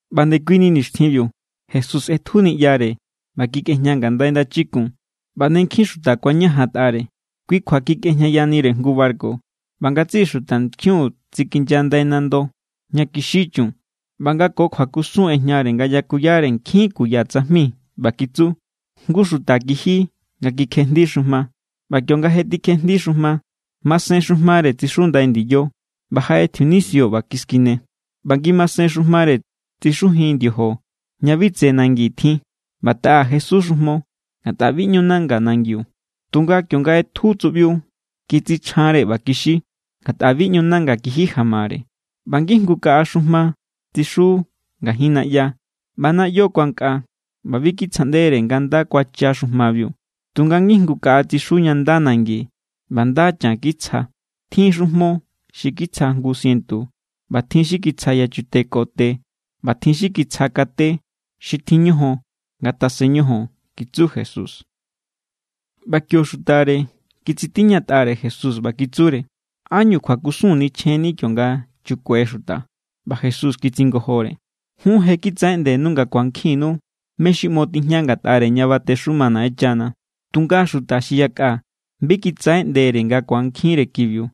ꞌBa ndekuini nixtjinbiu Jesús ꞌetju niꞌyare ꞌba kikꞌejña ngandai ndachikun, ꞌba ne nkjin xuta kuañajantꞌare. Kui kjua kikꞌejñayanire jngu barku, ꞌba ngatsiꞌi xutankjiun tsikinya ndai nando ña kixi chun. ꞌBa nga ko kjuakusun ꞌejñare nga yakuyare nkjin kuya tsajmi, ꞌba kitsu: —Jngu xuta kiji nga kikjejndi xujma. ꞌBa kionga je tikjejndi xujma, masen xujmare tsixu ndai ndiyo. ꞌBa jaꞌe tjiunisio ꞌba kiskine. ꞌBa ngimasen xujmare tsixujin ndiojo ña bi tse nangi tjin. ꞌBa taꞌa jesu xujmo, ngatꞌa bi ꞌñu nanga nangiu. Tunga kionga ꞌetju tsuꞌbiu, kitsichjanre ꞌba kixi, ngatꞌa bi ꞌñu nanga kiji jamare. ꞌBa ngijngu kaꞌa xujma tsixu ngajin naꞌya. ꞌBa naꞌyo kuankꞌa ꞌba bi kitsjaꞌndere nga nda kuacha xujmabiu. Tunga ngijngu kaꞌa tsixu ña nda nangi ꞌba nda chan kitsja. Tjin xujmo xi kitsja jngu sientu, ꞌba tjin xi kitsja yachute ko te, ꞌba tjin xi kitsja kate. Xi tjin ñojon, ngatasen ñojon —kitsu Jesús. ꞌBa kio xutare kitsitiñatꞌare Jesús ꞌba kitsure: —¿Ánñu kjuakusun nichjenni kionga chukue xuta? ꞌBa Jesús kitsingojore: —Jun je kitsaꞌeꞌndenu nga ku̱ankjinnu mé= xi ꞌmo tijña ngatꞌare ña batexuma Naꞌenchana. Tunga xuta xi yakꞌa bi kitsaꞌeꞌndere nga ku̱ankjinre kibiu.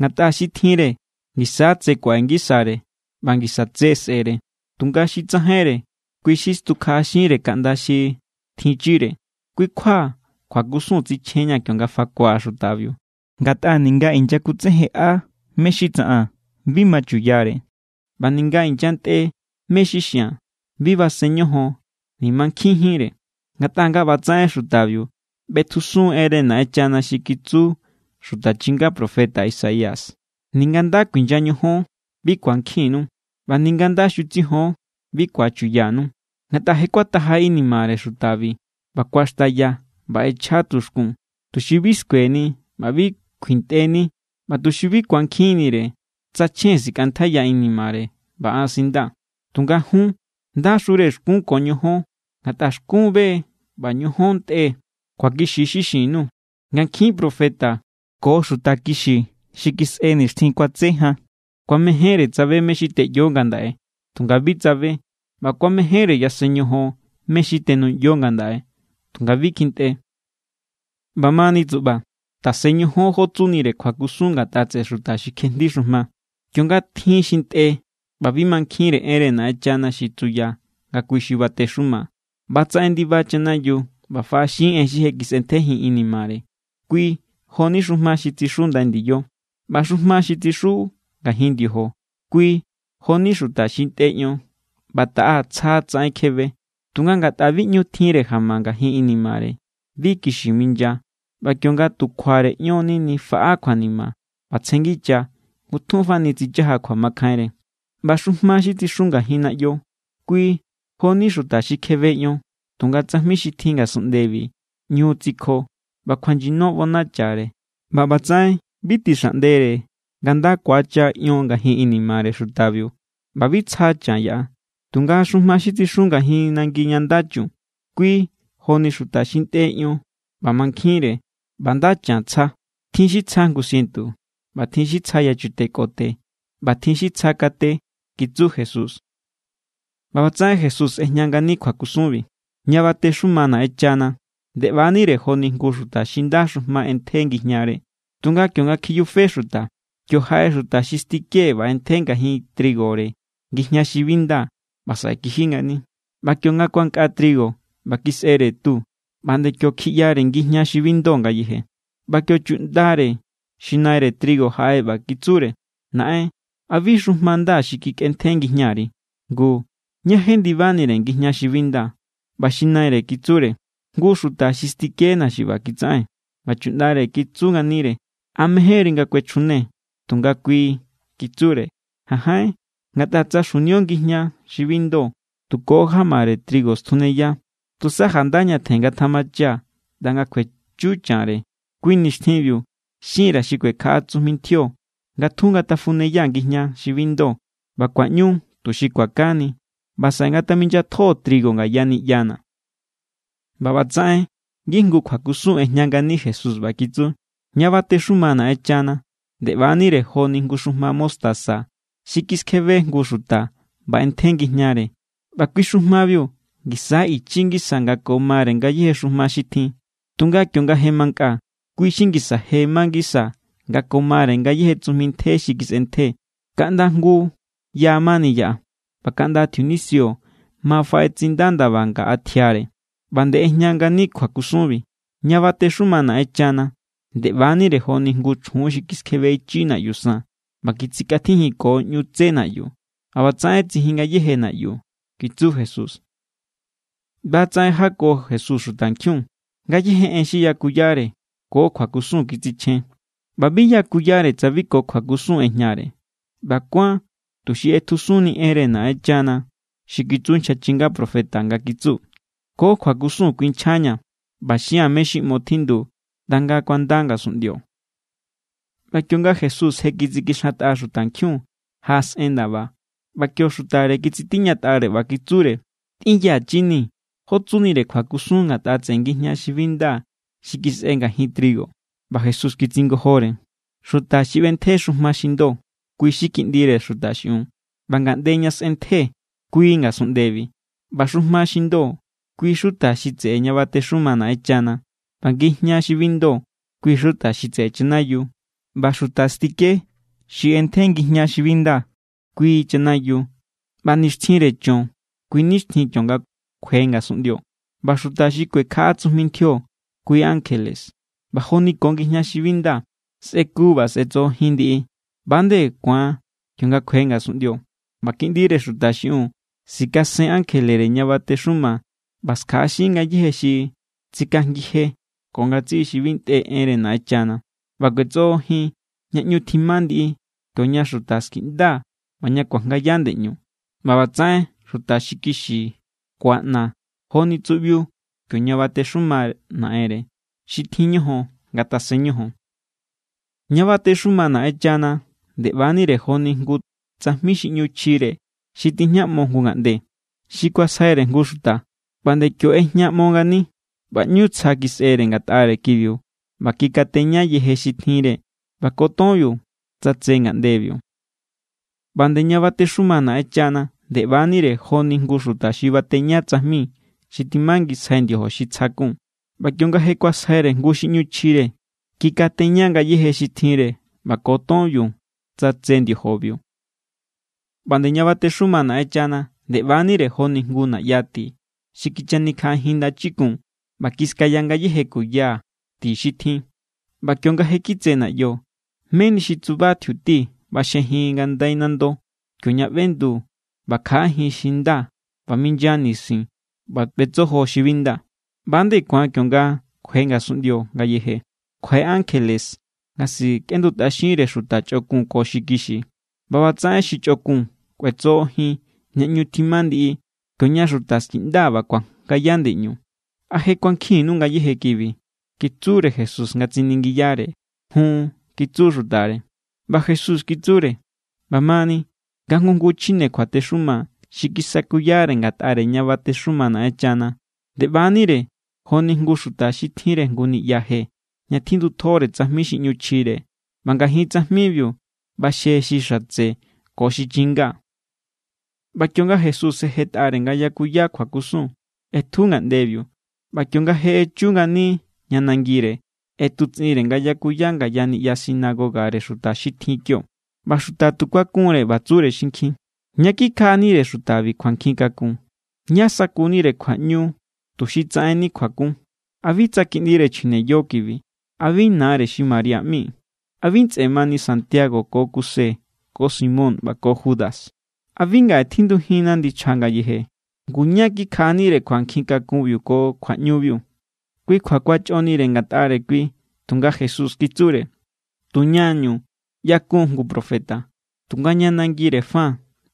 Ngatꞌa xi tjinre, ngisa= tse kuaꞌe ngisare ꞌba ngisa tse sꞌe̱re. Tunga xi tsajainre, kui= xi stukjaꞌaxinre kaꞌnda xi tjinchire. Kui= kjua kjuakusun tsichjenña̱ kionga fakua̱ xutabiu. Ngatꞌa ninga inyakutsejenꞌa mé= xi tsaꞌan, bi machuyare. ꞌBa ninga inyantꞌe mé= xi xia̱n, bi basen ñojon ni̱ mankjinjínre. Ngatꞌa nga ꞌba tsaꞌen xutabiu ꞌbetjusun enre Naꞌenchana xi kitsu xuta chinga profeta Isaías: Ninga nda kuinya ñojon, bi ku̱ankjinnu, ꞌba ninga nda xutsijon, bi ku̱achuyanu. Ngatꞌa je kuataja inimare xutabi, ꞌba kuaxtaya ꞌba ꞌechja tuxkun, tuxi bi skueni ꞌba bi kuintꞌeni, ꞌba tuxi bi ku̱ankjinnire, tsa chjen sikꞌantjaiya inimare ꞌba an sindaa̱. ’Tunga jun, ¡ndaxure xkún ko ñojón! Ngatꞌa xkún be= ꞌba ñojón ntꞌe=. Kjuakixi= xi xin_nuu̱ nga nkjin profeta ko xuta kixi xi kisꞌe nixtjin kuatse jan kuamejénre tsabe mé= xi teꞌyo ngandaꞌe, tunga bi tsabe. ꞌBa kuamejénre yasen ñojon mé= xi tenuꞌyo ngandaꞌe, tunga bi kjintꞌe. ’ꞌBamani tsuꞌba, tasen ñojon jó tsunire kjuakusun ngatꞌa tseꞌe xuta xi kjejndi xujma. Kionga tjin xi ntꞌe ꞌba bi mankjinre enre Naꞌenchana xi tsuya nga kui= xi batexuma, ꞌbatsaꞌen ndiba chanayiu ꞌba faꞌaxin en xi je kisꞌentjejin inimare. Kui jo=ni xujma xi tsixu ndai ndiyo. ꞌBa xujma xi tsixu ngajin ndiojo, kui joni xuta xi ntꞌe ion ꞌba taꞌa tsja tsaꞌen kjebe. Tunga ngatꞌa bi ꞌñu tjinre jama ngajin inimare, bi kixi minya. ꞌBa kionga tu kjuare ion nini faꞌa kjuanima ꞌba tsjenngicha ngutjunfani tsichaja kjuamakjainre. ꞌBa xujma xi tsixu ngajin naꞌyo, kui joni xuta xi kjebe ion, tunga tsajmi xi tjin ngasunꞌndebi ꞌñu tsikjo ꞌba kjuanyino ꞌbonachare. ꞌBa ꞌbatsaꞌen bi tixaꞌndere nga nda ku̱acha ion ngajin inimare xutabiu ꞌba bi tsja chan yaꞌa. Tunga xujma xi tsixu ngajin nangi ña nda chun, kui joni xuta xi ntꞌe ion ꞌba mankjinre ꞌba nda chan tsja. Tjin xi tsja jngu sientu, ꞌba tjin xi tsja yachute ko te, ꞌba tjin xi tsja kate —kitsu Jesús. ꞌBa ꞌbatsaꞌen Jesús ꞌejña ngani kjuakusunbi: —Ña batexuma Naꞌenchana nde ꞌba=nire joni jngu xuta xi nda xujma ꞌentje ngijñare. Tunga kionga kjiyufe xuta, kio jaꞌe xuta xi stike ꞌba ꞌentje ngajin trigore ngijña xi bi nda ꞌba saꞌe kiji ngani. ꞌBa kionga kuankꞌa trigo ꞌba kisꞌere tu, ꞌba nde kio kjiꞌyare ngijña xi bi ndo ngayeje. ꞌBa kio chuꞌndare xi naire trigo jaꞌe ꞌba kitsure: “Naꞌen, ¿a bi xujma nda xi kikꞌentje ngijñari? Ngu, ¿ñá jendibanire ngijña xi bi nda?” ꞌBa xi naire kitsure: “Jngu xuta xi stikena̱ xi ꞌba kitsaꞌen.” ꞌBa chuꞌndare kitsu nganire: “¿A mejénri nga kuechjune?” Tunga kui kitsure: “Janjain, ngatꞌa tsa xjunio ngijña xi bi ndo, tu ko jamare trigo stjuneya. Tusa janda ñatjen ngatamacha ꞌnda nga kjuechu chanre. Kui nixtjinbiu xin_ra̱ xi kuekjaꞌa tsujmi ntjio nga tjun ngatafuneya ngijña xi bi ndo ꞌba kuaꞌñu tuxi kuakani. ꞌBa saꞌe ngataminyatjo trigo ngaya niꞌyana̱.” ꞌBa ꞌbatsaꞌen ngijngu kjuakusun ꞌejña ngani Jesús, ꞌba kitsu: —Ña batexuma Naꞌenchana nde ꞌba=nire joni jngu xujma mostaza xi kiskjebe jngu xuta ꞌba ꞌentje ngijñare. ꞌBa kui xujmabi ngisa= ichi ngisa nga ko mare ngayéje xujma xi tjin. Tunga kionga je mankꞌa, kui= xi ngisa je ma ngisa nga ko mare ngayéje tsujmi ntje xi kisꞌentje. Kaꞌnda jngu ya mani yaꞌa, ꞌba kaꞌnda tjiunisio ma faꞌetsinda ndaba ngaꞌa tjiare. ꞌBa nde ꞌejña ngani kjuakusunbi: —Ña batexuma Naꞌenchana nde ꞌba=nire joni jngu chjun xi kiskjebe ichi naꞌyu san ꞌba kitsikꞌatjijinko ꞌñu tsé naꞌyu. ꞌBa ꞌbatsaꞌen tsijin ngayéje naꞌyu —kitsu Jesús. ꞌBa= tsaꞌen jako Jesús xutankjiun. Ngayéje en xi yakuyare ko kjuakusun kitsichjen, ꞌba bi yakuyare tsa bi ko kjuakusun ꞌejñare. ꞌBa kuán tuxi ꞌetjusunni enre Naꞌenchana xi kitsu nchja chinga profeta nga kitsu: Ko kjuakusun kuinchjaña̱, ꞌba xia̱n mé= xi ꞌmo tjindu, ꞌnda nga kuanda ngasunꞌndio. ꞌBa kionga Jesús je kitsikixantꞌa xutankjiun, jaꞌasꞌen ndaba, ꞌba kio xutare kitsitiñatꞌare ꞌba kitsure: —Tꞌinyachini̱ jó tsunire kjuakusun ngatꞌa tseꞌe ngijña xi bi nda xi kisꞌe ngajin trigo. ꞌBa Jesús kitsingojore: —Xuta xi ꞌbentje xujma xi ndo, kui= Kiꞌndire Xuta xiꞌiun. ꞌBa ngaꞌnde ña sꞌentje, kui ngasunꞌndebi. ꞌBa xujma xi ndo, kui= xuta xi tseꞌe ña batexuma Naꞌenchana. ꞌBa ngijña xi bi ndo, kui= xuta xi tseꞌe chanayiu. ꞌBa xuta stike xi ꞌentje ngijña xi bi nda, kui chanayiu. ꞌBa nixtjinre cho̱n, kui nixtjin kionga kjue ngasunꞌndio. ꞌBa xuta xi kuekjaꞌa tsujmintjio, kui= ankjele. ꞌBa joni ko ngijña xi bi nda sꞌeku ꞌba sꞌetsojojin ndiꞌi, ꞌba=nde ku̱an kionga kjue ngasunꞌndio. ꞌBa Kiꞌndire Xuta xiꞌiun sikasen ankjelere ña batexuma ꞌba skjaꞌaxin ngayéje xi tsikajngije ko ngatsiꞌi xi bi ntꞌe enre Naꞌenchana. ꞌBa kꞌuetsojojin ña ꞌñu tjima ndiꞌi, kioña xuta skiꞌnda ꞌba ña kuajngaya ndeꞌñu. ꞌBa ꞌbatsaꞌen xuta xi kixi kuaꞌna= joni tsuꞌbiu kioña batexuma Naꞌenre. Xi tjin ñojon, ngatasen ñojon. ’ꞌÑa batexuma Naꞌenchana nde ꞌba=nire joni jngu tsajmi xi ꞌñu chjire xi tijñaꞌmo jngu ngaꞌnde. Xi kuasjaire jngu xuta, ꞌba nde kio= ꞌejñaꞌmo ngani. ꞌBa ꞌñu tsja kisꞌere ngatꞌare kibiu ꞌba kikateña yeje xi tjinre ꞌba ko tonbiu tsatse ngaꞌndebiu. ’ꞌBa nde ña batexuma Naꞌenchana nde ꞌba=nire joni jngu xuta xi bateña tsajmi xi timangisjai ndiojo xi tsja kun. ꞌBa kionga je kuasjaire jngu xi ꞌñu chjire, kikateña ngayéje xi tjinre ꞌba ko tonbiu tsatse ndiojobiu. ’ꞌBa nde ña batexuma Naꞌenchana nde ꞌba=nire joni jngu naꞌya ti xi kichanikjaꞌajin ndachikun ꞌba kiskaya ngayéje kuya ti xi tjin. ꞌBa kionga je kitse naꞌyo, meni xi tsuba tjiuti ꞌbaxjejin ngandai nando, kioña ꞌbendu ꞌba kjaꞌajin xi nda ꞌba minya nisin ꞌba ꞌbetsojo xi bi nda. ꞌBa=nde ku̱an kionga kjue ngasunꞌndio ngayeje. Kjuaꞌe ankjele nga sikꞌendutꞌaxinre xuta chꞌokun ko xi kixi. ꞌBa ꞌbatsaꞌen xi chꞌokun kꞌuetsojojin ña ꞌñu tjima ndiꞌi, kioña xuta skiꞌnda ꞌba kuajngaya ndeꞌñu. ’¿A je kuankjinnu ngayéje kibi? —kitsure Jesús nga tsiningiyare. —Jun —kitsu xutare. ꞌBa Jesús kitsure: —ꞌBamani nga jngu jngu chjine kjuatexuma xi kisakuyare ngatꞌare ña batexuma Naꞌenchana, nde ꞌba=nire joni jngu xuta xi tjinre jngu niꞌya je, ña tjindutjore tsajmi xi ꞌñu chjire. ꞌBa ngajin tsajmibiu ꞌbaxje xi xatse ko xi chinga. ꞌBa kionga Jesús je jetꞌare nga yakuya kjuakusun, ꞌetju ngaꞌndebiu. ꞌBa kionga je echu ngani ña nangire, ꞌetutsꞌinre nga yakuya ngaya niꞌya sinagogare xuta xi tjin kio. ꞌBa xuta tu kuakunre, ꞌba tsure xinkjin: —¿Ñá kikjaꞌanire xutabi kjuankjinkakun? ¿Ñá= sakunire kjuaꞌñu tuxi tsaꞌenni kjuakun? ¿A bi tsa kiꞌndire chjine yo kibi? ¿A bi nare xi María ꞌmi? ¿A bi ntsꞌe mani Santiago ko Kuse ko Simón ꞌba ko Judas? ¿A bi ngaꞌe tjindujinna ndichja ngayeje? Ngu, ¿ñá= kikjaꞌanire kjuankjinkakun ko kjuaꞌñubiu? Kui kjua kuachꞌonire ngatꞌare kui. Tunga Jesús kitsure: —Tuñañu ꞌyakun jngu profeta, tunga ña nangire fa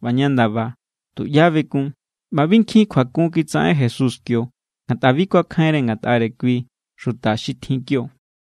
ꞌba ña ndaba, tuꞌyá bekun. ꞌBa bi nkjin kjuakun kitsaꞌen Jesús kio, ngatꞌa bi kuakjainre ngatꞌare kui xuta xi tjin kio.